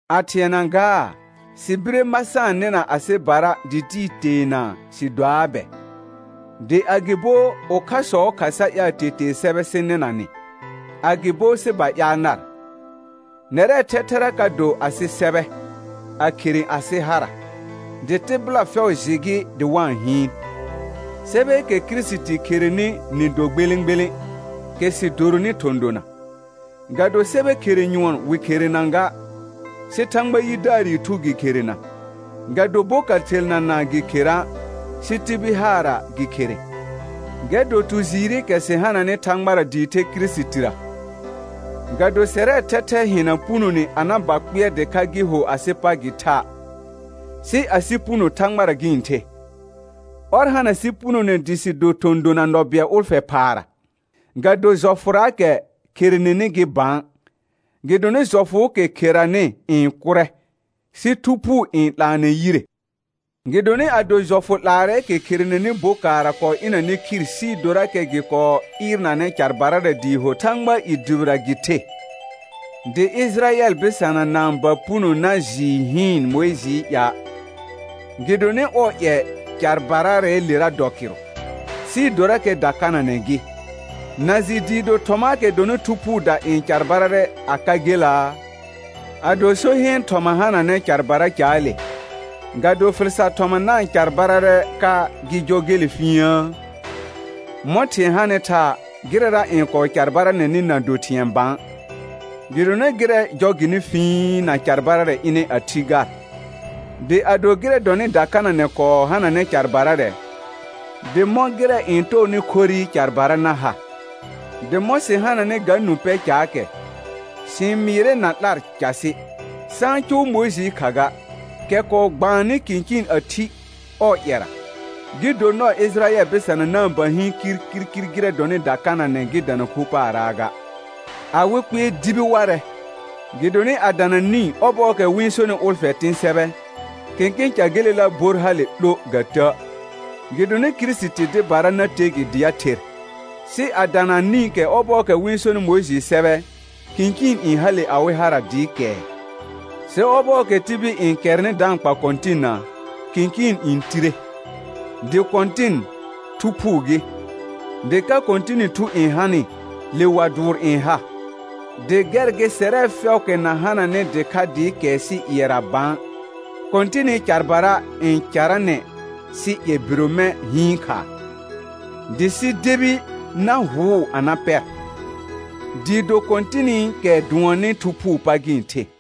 A thɩɛna gaa, sɩ bire ma sa-n nɩna asɩbara dɩ tɩɩ teenaa sɩ doaa bɛ? Dɩ agɩbo ʋkhasɔɔ kha sa ƴaal tetee sɛbɛ sɩ nɩna nɩ, agɩbo sɩ ba ƴaal nar? Nɛrɛɛ thɛthɛra ka do asɩ sɛbɛ, a khere asɩ hara, dɩ tɩbɩla fɛʋ jɩ gɩ dɩ wa-n hɩɩn. Sɛbɛɛkɛ Kirisiti kherenɩ nɩ do gbelẽ gbelẽ, kɛ sɩ doronɩ thɔ̃ dona. Ga do sɛbɛ khere nƴʋɔn wɩ kherena ga, sɩ Thãgba yidaarɩ Thu gɩ kherena, ga do boka thelnaana gɩ khera', sɩ tibil haarra gɩ khere. Gɛr dɔ tu jɩɩrɩkɛ sɩ hananɩ Thãgbara dɩɩ the Kirisitira. Ga do sɛrɛɛ thɛthɛ hɩna punone a na ba kpɩɛr dɩkha gɩ ho asɩ pa gɩ tha', sɩ asɩ puno Thãgbara gɩ-n the. Ɔr hana sɩ punone dɩ sɩ do thɔ̃ dona nɔ bɩɛl ʋlfɛ phaara, ga do jɔfʋraakɛ kherenenɩ gɩ bã, gɩdonɩ jɔfʋʋkɛ kheranɩ n kʋrɛ, sɩ Thu Phuu n 'laanɛ yire. Gɩdonɩ ado jɔfʋ 'laarɛɛkɛ kherenenɩ bokaarra kɔɔ ɩnanɛ khir sɩɩ dorakɛ gɩ kɔɔ ɩɩrnanɛ carbararɛ dɩɩ do Thãgbaa i dʋbɩra gɩ the, dɩ Ɩjɩrayɛl bɩsana na-n ba puno na jɩɩ hɩɩn Mʋɩjɩɩ ƴa', gɩdonɩ ɔɔ ƴɛ carbaraalera dɔ kɩrʋ, sɩɩ dorakɛ dakananɛ gɩ, na jɩ dɩɩ do thɔmaakɛ dɔnɩ Thu Phuuda n carbararɛ a ka gelaa? Ado so heen thɔma hananɛ carbara caale, ga do fɩl sar thɔma na-n carbararɛ ka gɩ jɔ gele fĩiəə? Mɔ̃ thɩ̃ɛ hanɩ thaa, gɩrɛra n kɔɔ carbaranɛnɩ na do thɩ̃ɛ bã, gɩdonɩ gɩrɛ jɔ gɩnɩ fĩi na carbararɛ ɩnɛ a thi gar. Dɩ ado gɩrɛ dɔnɩ dakananɛ kɔɔ hananɛ carbararɛ, dɩ mɔ̃ gɩrɛ n tɔɔnɩ khorrɩ carbara na ha? Dɩ mɔ̃ sɩ hananɩ ga nũ pɛ caakɛ, sɩ-n mɩɩrɛ na 'lar casɩ. Sa-n cʋʋ Mʋɩjɩɩ kha ga, kɛ kɔɔ gbaannɩ kɩ̃kɩɩn a thi ɔɔ ƴɛra, gɩ do nɔɔ Ɩjɩrayɛl bɩsana na-n ba hɩɩn kirkirkir gɩrɛ dɔnɩ dakananɛ gɩ dana khu paaraa ga. Awɩ kpɩɛr dibi warɛ, gɩdonɩ a dana nĩ ɔbɔɔkɛ wɩ-n sonɩ ʋlfɛ tɩ̃ sɛbɛ, kẽkẽ ca gelela bor hale 'lo ga tə', gɩdonɩ Kirisiti dɩbara na te gɩ dɩ a ther. Sɩ a dana nĩkɛ ɔbɔɔkɛ wɩ-n sonɩ Mʋɩjɩɩ sɛbɛ, kɩ̃kɩɩn n hale awɩ hara dɩɩ kɛɛ. «Sɩ ɔbɔɔkɛ tibil n kɛrnɩ da-n kpa Kɔ̃tɩnna, kɩ̃kɩɩn n tire.» Dɩ Kɔ̃tɩn, Thu Phuu gɩ; dɩ ka Kɔ̃tɩnɩ Thu n hanɩ, le wa dʋʋr n ha. Dɩ gɛr gɩ sɛrɛ fɛʋʋkɛ na hananɩ dɩkha dɩɩ kɛɛ sɩ ƴɩɛra bã, Kɔ̃tɩnɩ carbara n caranɛ sɩ ƴɛ bire mɛ̃ hɩɩn khaa, dɩ sɩ debi na hʋʋ a na pɛr, dɩɩ do Kɔ̃tɩnɩkɛ dʋɔnnɩ Thu Phuu pa gɩ-n the.